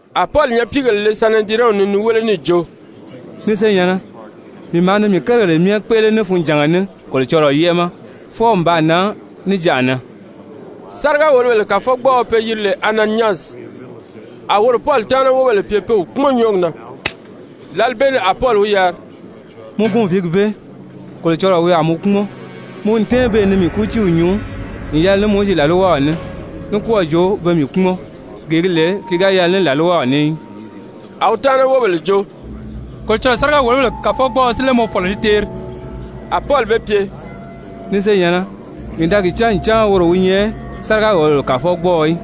A Pɔli nyapiigèle le Sanedirɛnw ni ni wéle níì jo: «Ni senyɛ̀nnɛ, mii maa ni mii kérigèle myɛ kpéʔele ní funjànga ní Kolocɔlɔɔ yɛ́ʔɛ ma fwɔɔ n baa nan níjanʔa na.» Sáriga-wòlobèle kàfɔgbɔɔɔ pe yiri lè Ananyasi, a woro Pɔli taana wóbèle pye pe wi kpúmɔn nyɔ́ɔgi na. Lǎli bee ni a Pɔli wi yari: «Mɔ gunviigi bee, Kolocɔlɔɔ wi a mɔ kpúmɔn! Mɔ n tɛ́ɛn beè ni mii kútiiw nyuu n yɛlɛ ní Mowizi làlwaw ní, ní kɔ́ɔ̀ jo pe mii kpúmɔn, gee gi lè ki ga yɛlɛ ní làlwaw ní í!» A wi taana wóbèle jo: «Kolocɔlɔɔ sáriga-wòlobèle kàfɔgbɔɔɔ si lé mɔ fɔ̀lɔ ni teeri?» A Pɔli be pye: «Ni senyɛ̀nnɛ, mii da gi cán ncan woro wi nyɛ sáriga-wòlobèle kàfɔgbɔɔɔ í.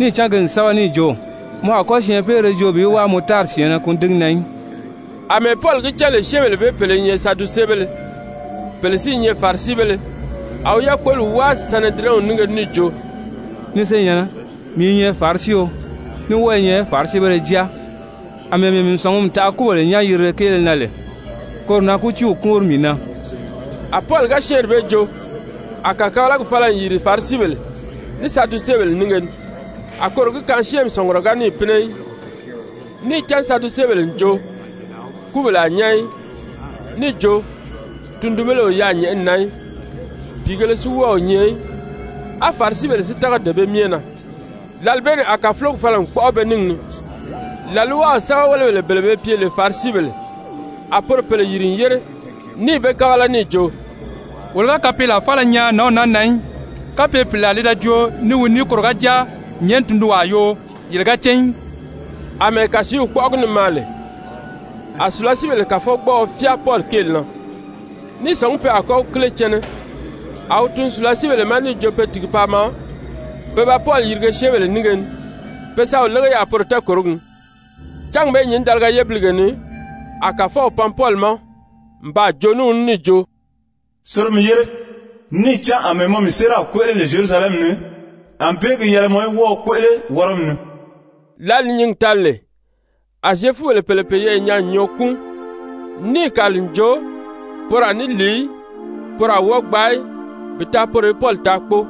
Níì cán ki n sɛ́bɛ níì jo: ‹Mɔ a kɔ́ syɛɛnpeere joo bi wáa mɔ tári syɛ̀ɛnnɛ kùndigi na í.›» Amɛɛ Pɔli gi cán lè syɛ́ɛnbèle bee pèle i nyɛ Sadusebéle, pèle si i nyɛ Farisibéle, a wi yákpoli wáa Sanedirɛnw nínge ni níì jo: «Ni senyɛ̀nnɛ, mii i nyɛ Farisio, ní wɔ́ɔ i nyɛ Farisibéle jáa. Amɛɛ mii mii sɔ̀ngumi taʔa kúbèle nyán-yirile kéele na lè, koro na kútiiw kúunri mii na.» A Pɔli ga syɛ́ɛnri bee joo, a kàkabalagi fala n yìri Farisibèle ní Sadusebèle nínge ni, a koro gi kaan syɛ́ɛnmi sɔ̀ngurɔ ga níì pínɛ í. Níì cán Sadusebèle n jo, kúbèle a nyán í, níì jo, tundunbéle o yaà nyɛ̀ʔɛni na í, pìigēle si wɔ́ɔ o nyɛ í, á Farisibèle si tága dee bee myɛ na. Lǎli bee ni a kàfulogi fala n kpɔ́ʔɔ be níngi ni. làlwaw sɛ́bɛwelebèle bele be pye lè Farisibèle, a poro pèle yìri n yére níì be kábala níì jo: «Wolo ga kapeelaa faala nyaa nǎnw naa na í. Kapye pìlaa li da joo ní wi ní koro ga jáa nyɛ̀ʔɛni tundunwaa yoo yele ga cán í.» Amɛɛ kàsiiw kpɔ́ʔɔgi ni maa lè, a sùlasiibèle kàfɔgbɔɔɔ fyáa Pɔli kéeli na ní i sɔ̀ngí pe a kɔ́ wi kíle cɛnɛ, a wi tun sùlasiibèle ma níì jo pe tìgi paa maa pe ba Pɔli yirige syɛ́ɛnbèle nínge ni pe sa wi lége yaà poro tɛɛkòrogi ni. Cángi bee nyǐndaliga yébilige ni a Kàfɔw pan Pɔli ma n baa joo ní wi ní níì jo: «Soro mi yére, níì cán àmɛɛ mɔ mii séeraw kpéʔele lè Zyerusalɛmi ni, ànbée gi yɛlɛ mɔ í wɔ́ɔ wi kpéʔele Wɔrɔmi ni.» Lǎli ni nyǐngi tali lè, a Zyefubèle pèle peyɛɛ nyaa n nyɔɔ kúun, níì kàli n jo, poro a ní lìi í, poro a wɔ́ɔ gbaa í bi taa poro í Pɔli taa kpóo.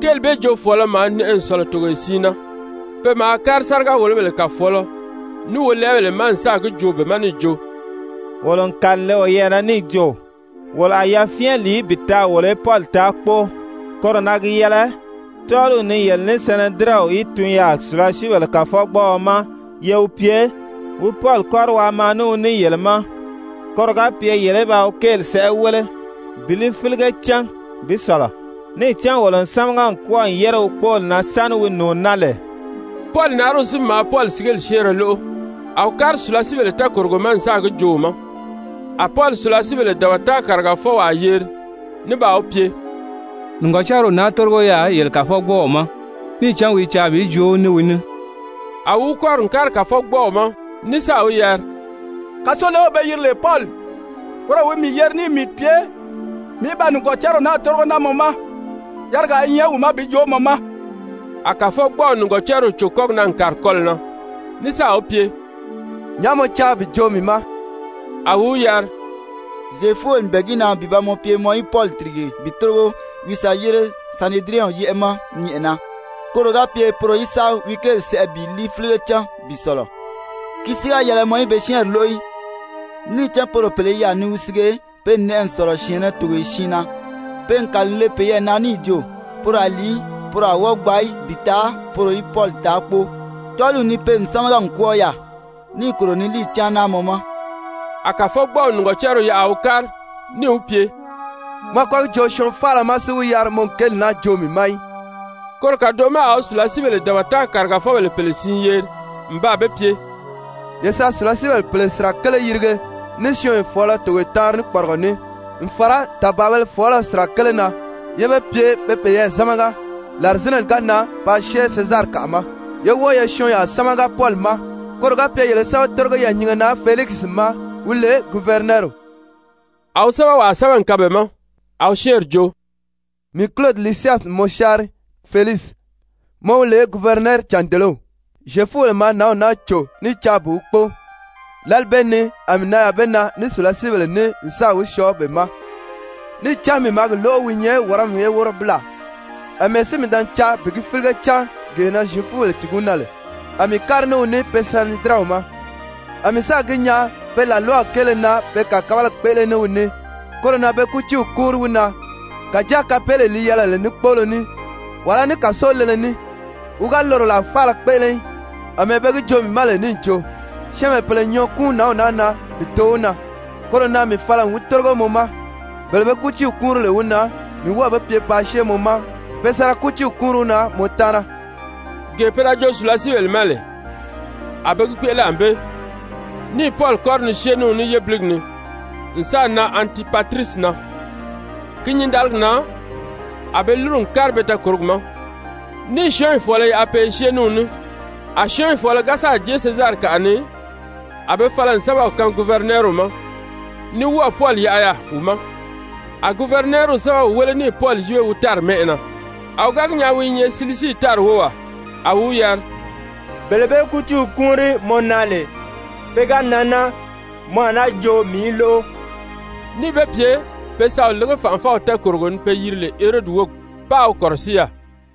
Kéeli bee joofɔɔlɔ maa nɛʔɛ n sɔ̀lɔ togoye siin na. Pe maa kári sáriga-wòlobèle kàfɔɔlɔ ní wolɛɛbèle ma n sáà gi joo be ma níì jo: «Wolo n kàli n le woyɛɛ na níì jo, wolo a yafyɛn lìi í bi taa wolo í Pɔli taa kpóo. Koro na gi yɛlɛ tɔ́ɔliw ni yele ní Sanedirɛnw í tun yaà sùlasiibèle kàfɔgbɔɔɔ ma ye wi pye wi Pɔli kɔ́ri waa maa ní wi ní yele ma koro ga pye yele í ba wi kéeli sɛʔɛ wéle bi li fílige cán bi sɔ̀lɔ. Níì cán wolo n sámaga n kwɔ́ɔ n yére wi kpóoli na sáni wi nùuni naa lè.» Pɔli nariw si maa Pɔli sigeli syɛ́ɛnrɛ lóʔo, a wi kári sùlasiibèle tɛɛkòrogo ma n sáà gi joo wi ma. A Pɔli sùlasiibèle dabata kàrigafɔwaa yeri ní baa wi pye: «Nìgɔcariw naa tórigo yaà yele kàfɔgbɔɔw ma, níì cán wi i caa bi joo ní wi ní.» A wi wi kɔ́ri n kári kàfɔgbɔɔw ma ní sáà wi yari: «Kàsolew pe yiri lè Pɔli, woro wi mii yeri níì mii pye mii í ba nìgɔcariw naa tórigo naa mɔ ma, yarigaa i wi ma bi joo mɔ ma.» A kàfɔgbɔɔw nìgɔcariw cò kɔ́gi na n kàri kɔlɔ̀ na ní sáà wi pye: «Nyàʔá mɔ caa bi joo mii ma?» A wi wi yari: «Zyefubèle n bɛ̀ɛ gi na bi ba mɔ pye mɔ í Pɔli tìrige bi tórigo wi sa yére Sanedirɛnw yɛ́ʔɛ ma nyɛ̀ʔɛna, koro ga pye poro í sa wi kéeli sɛʔɛ bi li fílige cán bi sɔ̀lɔ. Ki si ga yɛlɛ mɔ í be syɛ́ɛnri lóʔo í, níì cán poro pèle i yaà ni wi sige, pe n nɛʔɛ n sɔ̀lɔ syɛ̀ɛnnɛ togoye siin na, pe n kàli n le peyɛɛ na níì jo, poro a lìi í, poro a wɔ́ɔ gbaa í bi taa poro í Pɔli taa kpóo. Tɔ́ɔliw ni pe n sámaga n kwɔ́ɔ yaà, níì kòro ni líiyi cáan naa mɔ ma.» A kàfɔgbɔɔw nìgɔcariw yaʔa a wi kári níì wi pye: «Mɔ a kɔ́ gi joo syɔɔn faala ma si wi yari, mɔ n kéeli naa joo mii ma í.» Koro kàdoʔo ma a wi sùlasiibèle dabata kàrigafɔbèle pèle siin yeri n baa be pye: «Ye sa sùlasiibèle pèle sirakele yirige ní syɔɔnyɔ fɔ̀ɔlɔ togoye taanri ní kpɔrigɔ ní, n fàra tàbaabēle fɔɔlɔ sirakele na, yé be pye be peyɛɛ zámaga, làrizinɛni ga nan paa syée Sezarikaʔa ma. Yé wɔ́ɔ ye syɔɔnyaa sámaga Pɔli ma, koro ga pye yele í sa wi tórigo yɛɛ̀nyinge na Felikisi ma, wi lè guvɛrinɛɛriw.» A wi sɛ́bɛwaa sɛ́bɛ n kaan be ma, a wi syɛ́ɛnri jo: «Mii Kulodi Lisyasi n mɔ syáanri Felikisi, mɔ wi lè guvɛrinɛɛri-càndelew. Zyefubèle maa nǎnw naa cò ní i caa bi wi kpóo, lǎli bee ni a mii nan yaà be na ní sùlasiibèle ní n sáà wi syɔɔ be ma, níì cán mii maa gi lóʔo wi i nyɛ Wɔrɔmi ye wɔ́rɔbilaa. Amɛɛ si mii da ni caa bi gi fílige cán gee na Zyefubèle tìgi wi na lè, a mii kári ní wi ní pe Sanedirɛnw ma. A mii sáà gi nyaa pe làlwaw kéele na pe kàkabalagi kpéʔele ní wi ní, koro na be kútiiw kúunri wi na, kàjáa kapeelee li yɛlɛ lè ní kpóolo ní, wàlá ní kàso lele ní, wi ga loro làa faala kpéʔele í. Amɛɛ be gi joo mii ma lè níì jo, syɛ́ɛnbèle pèle n nyɔɔ kúun nǎnw naa na bi too wi na, koro na mii fala n wi tórigo mɔ ma, bele be kútiiw kúunri lè wi na, mii n wɔ́ɔ̀ be pye paa syée mɔ ma pe sa ra kútiiw kúunri wi na mɔ taana.» Gee pe da joo sùlasiibèle ma lè, a be gi kpéʔele ànbée, níì Pɔli kɔ́ri ni syée ní wi ní yébiligi ni n sáà nan Antipatirisi na. Ki nyǐndaligi na a be lúru n kári be tɛɛkòrogi ma, níì syɔ́ɔnyi fɔ̀ɔlɔ yaʔa pe i syée ní wi ní. A syɔ́ɔnyi fɔ̀ɔlɔ ga sáà jée Sezarikaʔa ni, a be fala n sɛ́bɛw kaan guvɛrinɛɛriw ma, ní wɔ́ɔ̀ Pɔli yaʔa yaà wi ma. A guvɛrinɛɛriw sɛ́bɛw wéle níì Pɔli yíbe wi tári mɛ́ʔɛ na. A wi ga gi nyaa wi i nyɛ Silisii tári wówaa, a wi wi yari: «Bele be kútiiw kúunri mɔ na lè, pe ga nan naa, mɔ a náa joo mii í lóʔo,» níì be pye pe sa wi lége fànʔafɔw tɛɛkòrogo ni pe yiri lè Herodi wógi, páā wi kɔ̀rɔsíi yaà.